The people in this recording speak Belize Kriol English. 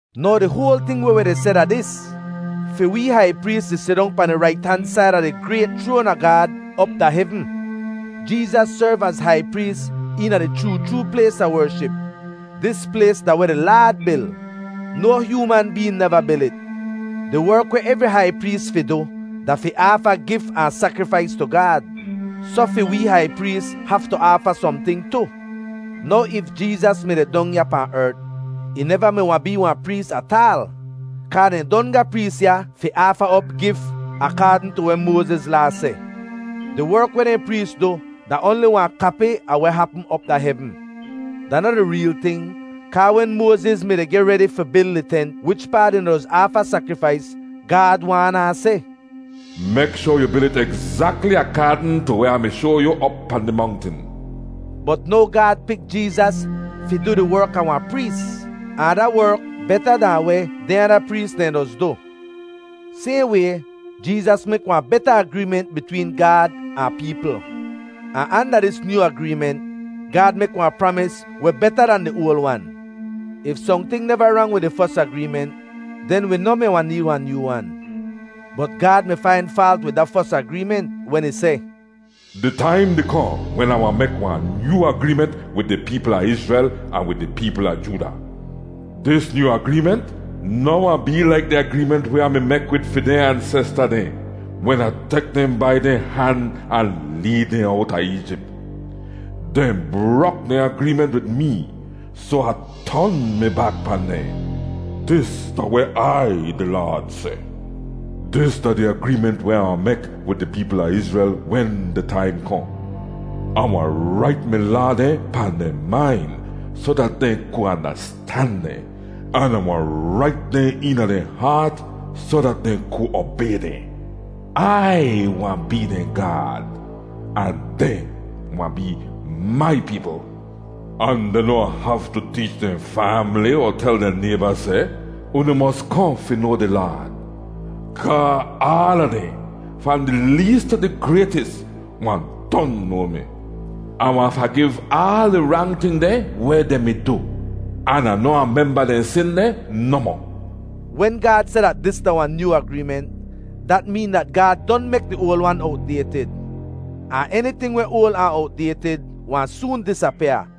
Now di hoal ting weh wi di seh da dis: Fi wee hai prees di sidong pahn di rait han said a di grayt chroan a Gaad op da hevn. Jeezas serv az hai prees eena di chroo chroo plays a wership. Dis plays da weh di Laad bil. No hyooman been neva bil it. Di werk weh evri hai prees fi du da fi aafa gif ahn sakrifais tu Gaad, soh fi wee hai prees haftu aafa sohnting tu. Now if Jeezas mi deh dong ya pahn ert, ih neva mi wahn bee wahn prees ataal, kaa dehn don ga prees ya fi aafa op gif akaadn tu weh Moaziz Laa seh. Di werk weh dehn prees du da oanli wahn kapi a weh hapm op da hevn. Da noh di reel ting. Kaa wen Moaziz mi-di geh redi fi bil di tent wichpaa dehn doz aafa sakrifais, Gaad waan ahn seh, “Mek shoar yu bil it egzakli akaadn tu weh Ah mi shoa yu op pahn di mongtin.” Bot now Gaad pik Jeezas fi du di werk a wahn prees, ahn da werk beta dahn weh dehn ada prees dehn doz du. Sayhn way, Jeezas mek wahn beta agreement bitween Gaad ahn peepl, ahn anda dis nyoo agreement, Gaad mek wahn pramis weh beta dan di oal wan. If sohnting neva rang wid di fos agreement, den wi noh mi wahn need wahn nyoo wan. Bot Gaad mi fain faalt wid da fos agreement wen ih seh, “Di taim di kohn wen Ah wahn mek wahn nyoo agreement wid di peepl a Izrel ahn wid di peepl a Jooda. Dis nyoo agreement noh wahn bee laik di agreement weh Ah mi mek wid fi dehn ansesta dehn, wen Ah tek dehn bai dehn han ahn leed dehn owta Eejip. Dehn brok dehn agreement wid mee, soh Ah ton mi bak pahn dehn. Dis da weh Ai di Laad seh. Dis da di agreement weh Ah wahn mek wid di peepl a Izrel wen di taim kohn: Ah wahn rait mi laa dehn pahn dehn main soh dat dehn ku andastan dehn, an Ah wahn rait dehn eena dehn haat soh dat dehn ku obay dehn. Ai wahn bee dehn Gaad, ahn dehn wahn bee mai peepl. Ahn dehn noh wahn haftu teech dehn faamli, er tel dehn nayba seh, ‘Unu mos kohn fi noa di Laad.’ Kaa aala dehn, fahn di lees tu di graytis, wahn don noa mi. Ah wahn fagiv aal di rang ting dehn weh dehn mi du, an Ah noh wahn memba dehn sin dehn nohmoh.” Wen Gaad seh dat dis da wahn nyoo agreement, dat meen dat Gaad don mek di oal wan owt-daytid. Ahn eniting weh oal ahn owt-daytid wahn soon disapyaa.